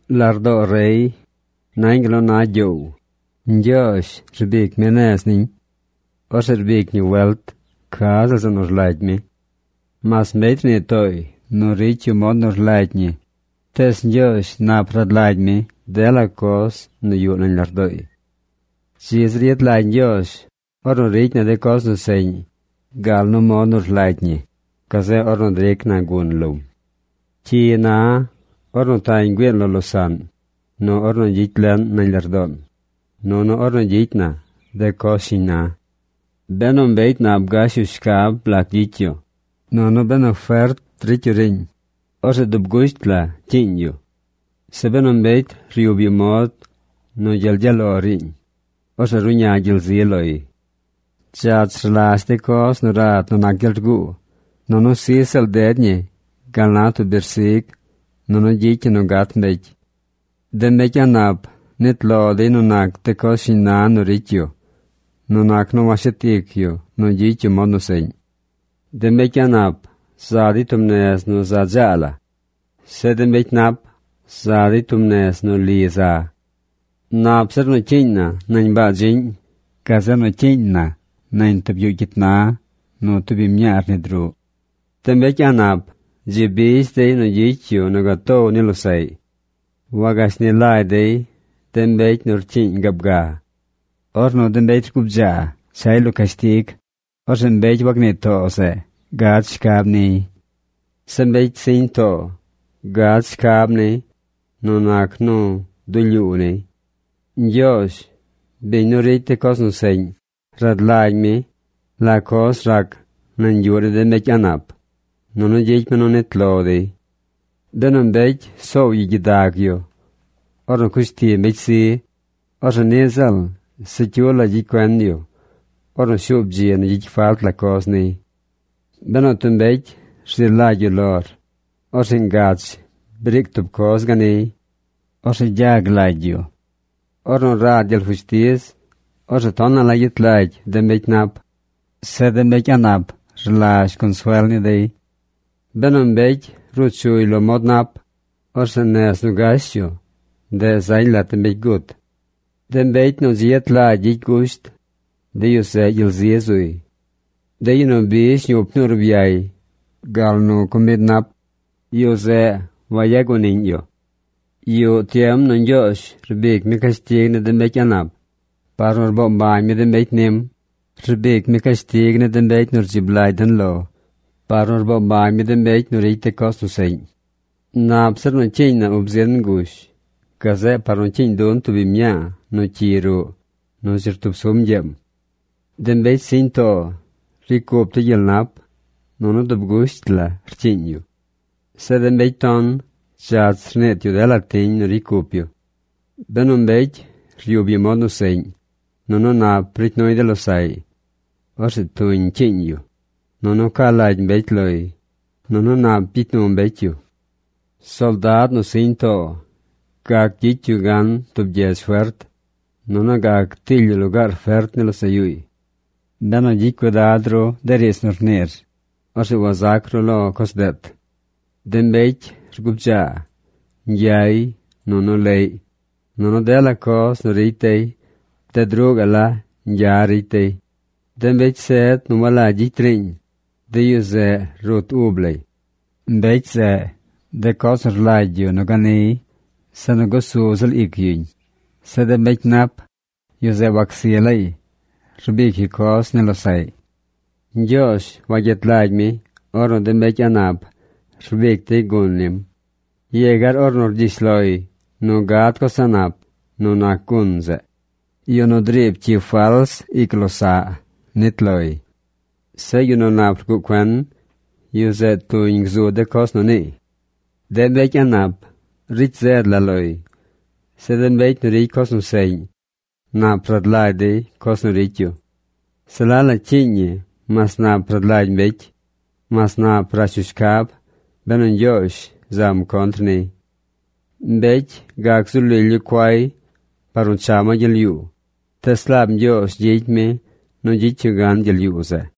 Lardoo rey nañ gal nu na gyoow. Ñgyoozh rbic mi nez niñ. Orzeꞌ rbic ñi welt ca ziꞌl zeꞌ nu rlagy mi. Mas mbecy rnii tooy nu ricy yu mod nu rlagy ñi, tees Ñgyoozh nap rad lagy mi dela coz nu yuꞌ nañ lardooy. Dzi zir yet lagy Ñgyoozh ornu ricy na de coz nu seꞌñ gal nu mod nu rlagy ñi, gazeꞌ ornu dric na gun lom. Cyi na ornu tañ güiin lo losaꞌn, nu ornu gyicy leꞌn nañ lardoon, nunu ornu gyicy na de coz shiñ na. Benu mbecy nap gash yu shcab lac gyicy yu, nunu benu fert ricy yu riiñ, orzeꞌ dub gusht la cyiiñ yu. Zeꞌ benu mbecy ryub yu mod nu gyel gyaꞌ lo riiñ, orzeꞌ ruꞌña gyel zi loy. Dzach rlazh de coz nu rad nu nac gyel rguu. Nunu sij ziꞌl ded ñi gal na tub birzigy nunu gyicy ñi nu gat mbecy. De mbecy a̱ꞌ nap nit lo dey nu nac de coz shiñ na nu ricy yu nu nac nu washet ic yu nu gyicy yu mod nu seꞌñ. De mbecy a̱ꞌ nap za dey tub nez nu za dzaa la. Zeꞌ de mbecy nap za dey tub nez nu li za. Nap zir nu cyiiñ na nañ baa dziꞌñ gazeꞌ nu cyiiñ na nañ tub yuꞌ cyit na nu tub biñ mñaa rnid ruꞌ. De mbecy a̱ꞌ nap dzi bizh dey nu gyicy yu nu gatow ni losaꞌy. Wagashni lagy dey de mbecy nu rcyiiñ gaab ga. Ornu de mbecy rguu bdzaa chay lo cashtig, orzeꞌ mbecy wacnii too zeꞌ gad shcab niy. Zeꞌ mbecy siñ too gad shcab niy nu nac nu dulyuu niy. Ñgyoozh, biñ, nu ricy de coz nu seꞌñ, rad lagy mi la coz rac nañ yuꞌ ni de mbecy a̱ꞌ nap, nunu gyicy mi nu nit lo dey. Benu mbecy soow yu gyidag yu ornu cush ti mbecy zi, orzeꞌ niꞌ ziꞌl se cyu la gyicy cuen yu ornu shuub dzi nu gyicy falt la coz niy. Benu tub mbecy rzi lagy yu lor, orzeꞌ ngach briic tub coz ganiy. Orzeꞌ gyag lagy yu. Ornu rad gyel fushtiz, orzeꞌ tonaꞌ la yet lagy de mbecy nap. Zeꞌ de mbecy a̱ꞌ nap rlazh consuel ni dey. Benu mbecy ruu chuy lo mod nap, orzeꞌ nez nu gash yu ndeꞌ zañ lat de mbecy gut. De mbecy nu dzi yet lagy gyicy gusht, de yu zeꞌ gyel zi zuy. De yu nu bizh ñup ni urbyay gal nu comid nap, yu zeꞌ wac yu mbecy guaniꞌñ. Yuꞌ tiem nu Ñgyoozh rbic mi cashtig ni de mbecy a̱ꞌ nap par nu rboo mbañ mi de mbecy nim. Rbic mi cashtig ni de mbecy nu rdzib lagy den lo par nu rboo mbañ mi de mbecy nu ricy de coz nu seꞌñ. Nap zir nu cyiiñ na ub zin ngush gazeꞌ par nu cyiiñ dun tub biñ mñaa nu cyi ruꞌ nu dzi rtub sum ñgyeem. De mbecy siñ too ricy cup dey gyel nap nunu dub gusht la rcyiiñ yu. Zeꞌ de mbecy ton dzach rniit yu dela tiñ nu ricy cup yu. Benu mbecy ryub yu mod nu seꞌñ, nunu nap ricy nuy de losaꞌy, orzeꞌ tuñ rcyiiñ yu, nunu ca lagy mbecy loy, nunu nap gyicy nu mbecy yu. Soldad nu siñ too gac gyicy yu gan tub gyedz fert, nunu gac tiily yu lugaar fert ni losaꞌ yuuy. Benu gyicy cuidad ru de riidz nu rniir, orzeꞌ wazac ru lo coz deet. De mbecy rguu bdzaa, ñgyay, nunu leꞌy, nunu dela coz nu ricy dey bded ruꞌ gaꞌ la ñgya ricy dey. De mbecy zed nu walagy gyicy riiñ, de yu zeꞌ rut ub lay. Mbecy zeꞌ, de coz nu rlagy yu nu gad ganiy, se nu gusu ziꞌl ic yuñ. Zeꞌ de mbecy nap, yu zeꞌ wacsi laay rbic yu coz ni losaꞌy. Ñgyoozh wagyet lagy mi ornu de mbecy a̱ꞌ nap rbic dey gun nim, yegar ornu rgyish loy nu gad coz a̱ꞌ nap nu nac gun zeꞌ. Yu nu driib cyi fals ic losaꞌ nit loy. Zeꞌ yu nu nap rguꞌ cuen, yu zeꞌ gzu tuñ coz nu niiy. De mbecy a̱ꞌ nap ricy zed la loy. Zeꞌ de mbecy nu ricy coz nu seꞌñ nap rad lagy dey coz nu ricy yu. Se la la cyiiñ ñi mas nap rad lagy mbecy, mas nap rash yu shcab benu Ñgyoozh zam contr niy. Mbecy gac zu lily yu cuay par nu cha ma gyel yuu, tees laab Ñgyoozh gyicy mi nu gyicy yu gan gyel yuu zeꞌ.